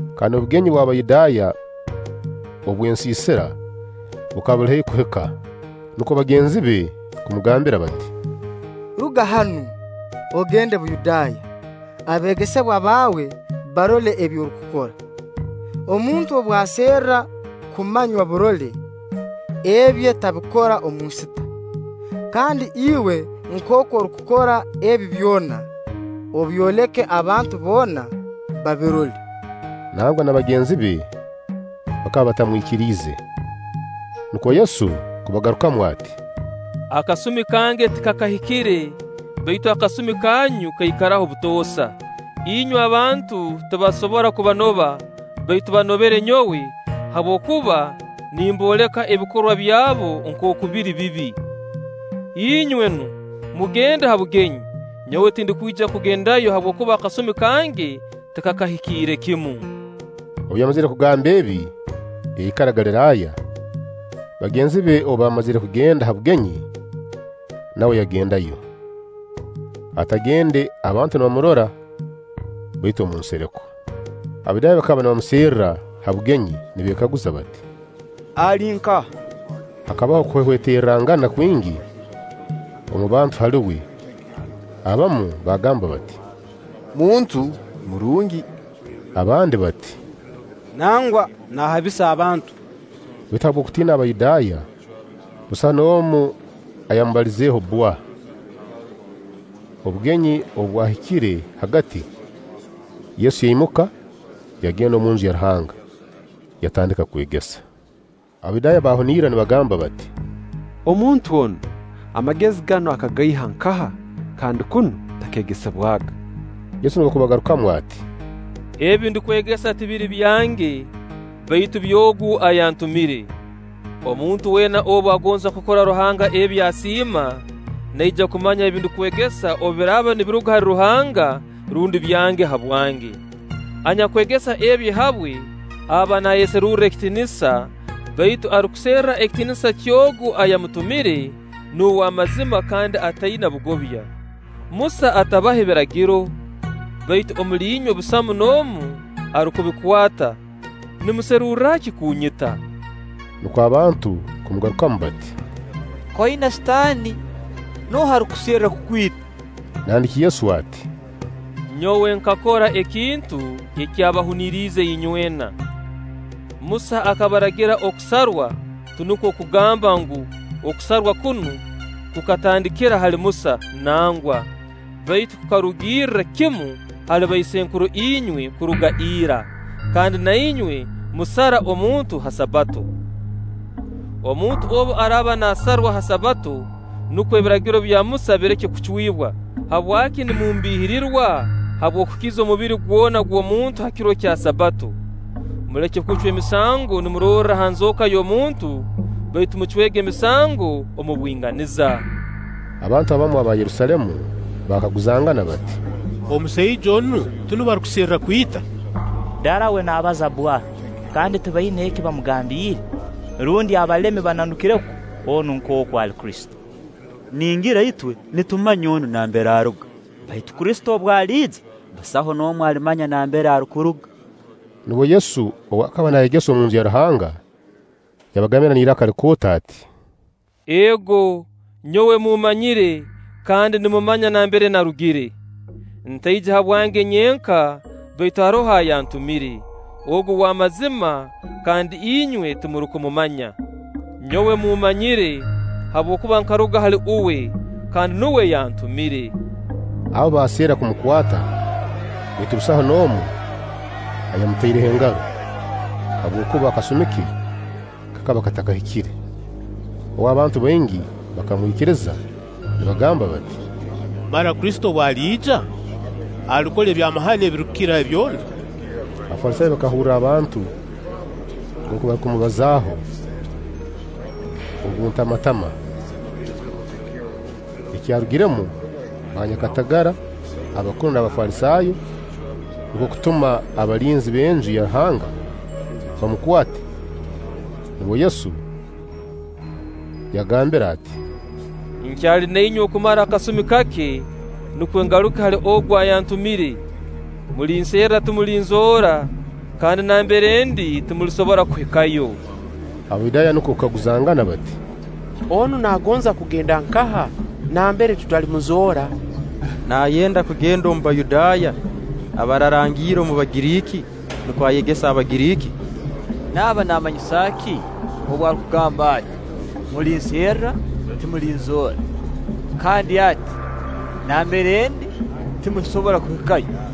Kandi obugenyi bw'Abayudaaya obw'Ensiisira bukaba buli haihi kuhika. Nukwo bagenzi be kumugambira bati: “Ruga hanu, ogende Buyudaaya, abeegesebwa baawe barole ebi orukukora. Omuntu obu aserra kumanywa burole, ebye tabikora omu nsita. Kandi iwe nkooku orukukora ebi byona, obyoleke abantu boona, babirole.” Nangwa n'abagenzi be bakaba batakamwikiriize. Nukwo Yesu kubagarukamu ati: “Akasumi kange tikakahikire, baitu akasumi kanyu kaikaraho butoosa. Inywe abantu tibasobora kubanoba, baitu banobere nyowe, habwokuba nimbooleka ebikorwa byabo nkooku biri bibi. Inywe nu, mugende ha bugenyi; nyowe tindukwija kugendayo habwokuba akasumi kange tikakahikiire kimu.” Obu yamazire kugamba ebi, yaikara Galiraaya. Bagenzi be obu baamazire kugenda ha bugenyi, nawe yagendayo. Atagende abantu nibamurora, baitu omu nsereko. Abayudaaya bakaba nibamuserra ha bugenyi, nibeekaguza bati: “Ali nkaha?” Hakabaho okuhwehweterrangana kwingi omu bantu hali uwe. Abamu baagamba bati: “Muntu murungi”; abandi bati: “Nangwa, naahabisa abantu”. Baitu habw'okutiina Abayudaaya, busaho n'omu ayamubalizeeho bbwa. Obugenyi obu bwahikire hagati, Yesu yaimuka, yagenda omunju ya Ruhanga, yatandika kwegesa. Abayudaaya baahunirra nibagamba bati: “Omuntu onu, amagezi ganu akagaiha nkaha kandi kunu takeegesebwaga?” Yesu nukwo kubagarukamu ati: “Ebi ndukwegesa tibiri byange, baitu by'Ogu ayantumire. Omuntu weena obu agonza kukora Ruhanga ebi asiima, naija kumanya ebi ndukwegesa obu biraaba nibiruga hali Ruhanga, rundi byange habwange. Anyakwegesa ebye habwe, aba naayeserurra ekitiinisa baitu arukuserra ekitiinisa ky'Ogu ayamutumire, nuwe w'amazima kandi ataina bugobya. Musa atabahe Biragiro? Baitu omuli inywe busamu n'omu arukubikwata. Nimuserurra ki kunyita?” Nukwo abantu kumugarukamu bati: “K'oina Sitaani! Nooha arukuserra kukwita?” Nandiki Yesu ati: “Nyowe nkakora ekintu ekyabahuniriize inywena. Musa akabaragira okusarwa (tinukwo kugamba ngu: okusarwa kunu kukatandikira hali Musa, nangwa; baitu kukarugirirra kimu hali baisenkuru inywe kuruga ira); kandi na inywe musara omuntu ha Sabbato. Omuntu obu araaba naasarwa ha Sabbato, nukwo Ebiragiro bya Musa bireke kucwibwa, habwaki nimumbiihirirwa habw'okukiza omubiri gwona gw'omuntu ha kiro kya Sabbato? Muleke kucwa emisango nimurorra ha nzooka y'omuntu, baitu mucwege emisango omu bwinganiza.” Abantu abamu aba Yerusaalemu baakaguzangana bati: “Omusaija onu tinuwe barukuserra kwita? Darawe naabaza bbwa, kandi tibaina eki bamugambiire! Rundi abalemi bananukire kwo onu nkooku ali Kristo? Ningira itwe nitumanya onu nambere aruga; baitu Kristo obu aliija, busaho n'omu alimanya nambere arukuruga.” Nubwo Yesu, ow'akaba naayegesa omunju ya Ruhanga, yagambire n'iraka likooto ati: “Ego, nyowe mummanyire, kandi nimumanya nambere naarugire. Ntaije habwange nyenka baitu haroho ayantumire, Ogu w'amazima, kandi inywe timurukumumanya. Nyowe mmumanyire, habwokuba nkaruga hali Uwe, kandi nuwe yantumire.” Aho baaserra kumukwata; baitu busaho n'omu ayamutaireho engaro, habwokuba akasumi ke kakaba katakahikire. Obu, abantu baingi bakamwikiriza nibagamba bati: “Mara Kristo obu aliija, alikora ebyamahano ebirukukira eby'onu?” Abafalisaayo bakahurra abantu nkooku barukumubazaaho obuntamantama. Ekyarugiremu: banyakatagara abakuru n'Abafalisaayo nukwo kutuma abalinzi b'Enju ya Ruhanga bamukwate. Nubwo Yesu yagambire ati: “Nkyali na inywe okumara akasumi kake; nukwo ngaruke hali Ogu ayantumire. Mulinserra, timulinzoora; kandi nambere ndi timulisobora kuhikayo.” Abayudaaya nukwo kukaguzangana bati: “Onu naagonza kugenda nkaha nambere tutalimuzoora? Naayenda kugenda omu Bayudaaya abaararangiire omu Bagiriiki nukwo ayegese Abagiriiki? Naaba naamanyisa ki obu arukugamba ati: ‘Mulinserra, timulinzoora’; kandi ati: ‘Nambere ndi timulisobora kuhikayo’?”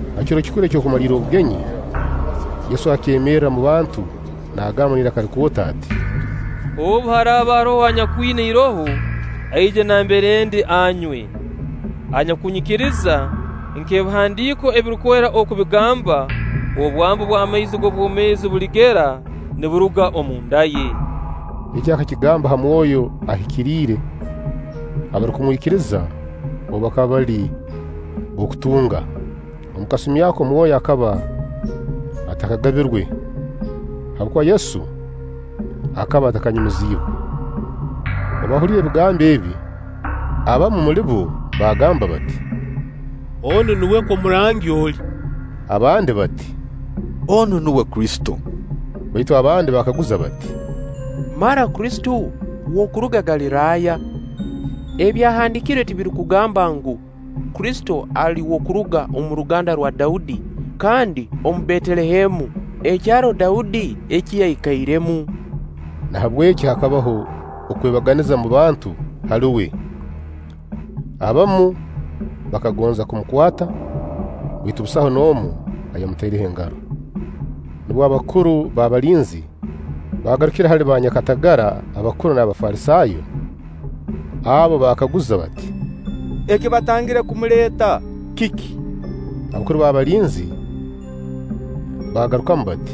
Ha kiro kikuru eky'okumalirra obugenyi, Yesu akeemerra mu bantu naagamba n'iraka likooto ati: “Obu haraaba haroho anyakwina iroho, aije nambere ndi, anywe. Anyakunyikiriza, nk'Ebihandiiko Ebirukwera oku bigamba: ‘Obwambu bw'amaizi g'obwomeezi buligera niburuga omunda ye.’” Eki akakigamba ha Mwoyo Ahikiriire, abarukumwikiriza ou bakaba bali b'okutunga. Omu kasumi ako Mwoyo akaba atakagabirwe, habwokuba Yesu akaba atakanyumiziibwe. Obu baahuliire ebigambo ebi, abamu muli bo baagamba bati: “Onu nuwe kwo murangi oli,” Abandi bati: “Onu nuwe Kristo.” Baitu abandi baakaguza bati: “Mara Kristo w'okuruga Galiraaya? Ebyahandiikirwe tibirukugamba ngu, Kristo ali w'okuruga omu ruganda rwa Daudi, kandi omu Betelehemu, ekyaro Daudi eki yaikairemu?” Nahabweki haabaho okwebaganiza omu bantu hali uwe. Abamu bakagonza kumukwata, baitu busaho n'omu ayamutaireho engaro. Nubwo abakuru b'abalinzi baagarukire hali baanyakatagara abakuru n'Abafalisaayo; abo baabakaguza bati: “Ekibatangire kumuleeta kiki?” Abakuru b'abalinzi baabagarukamu bati: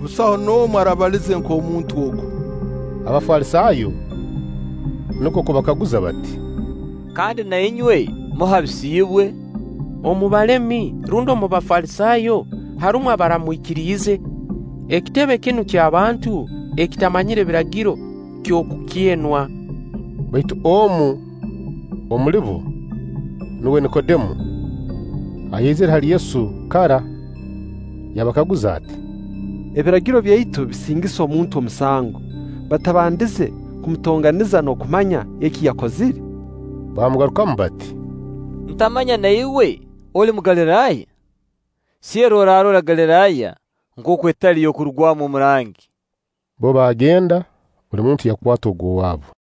“Busaho n'omu arabalize nk'omuntu ogu!” Abafalisaayo nukwo kubakaguza bati: “Kandi na inywe muhabisiibwe? Omu balemi rundi omu Bafalisaayo harumu abaramwikiriize? Ekitebe kinu ky'abantu ekitamanyire Biragiro, ky'okukyenwa.” Baitu omu omuli bo, nuwe Nikodemo ayaizire hali Yesu kara, yabakaguza ati: “Ebiragiro byaitu bisingisa omuntu omusango batabandize kumutonganiza n'okumanya eki yakozire?” Baamugarukamu bati: “Ntamanya na iwe oli Mugaliraaya? Serra, oraarora Galiraaya nkooku etali y'okurugwamu omurangi.” Bbo baagenda, buli muntu yakwata ogw'owaabu.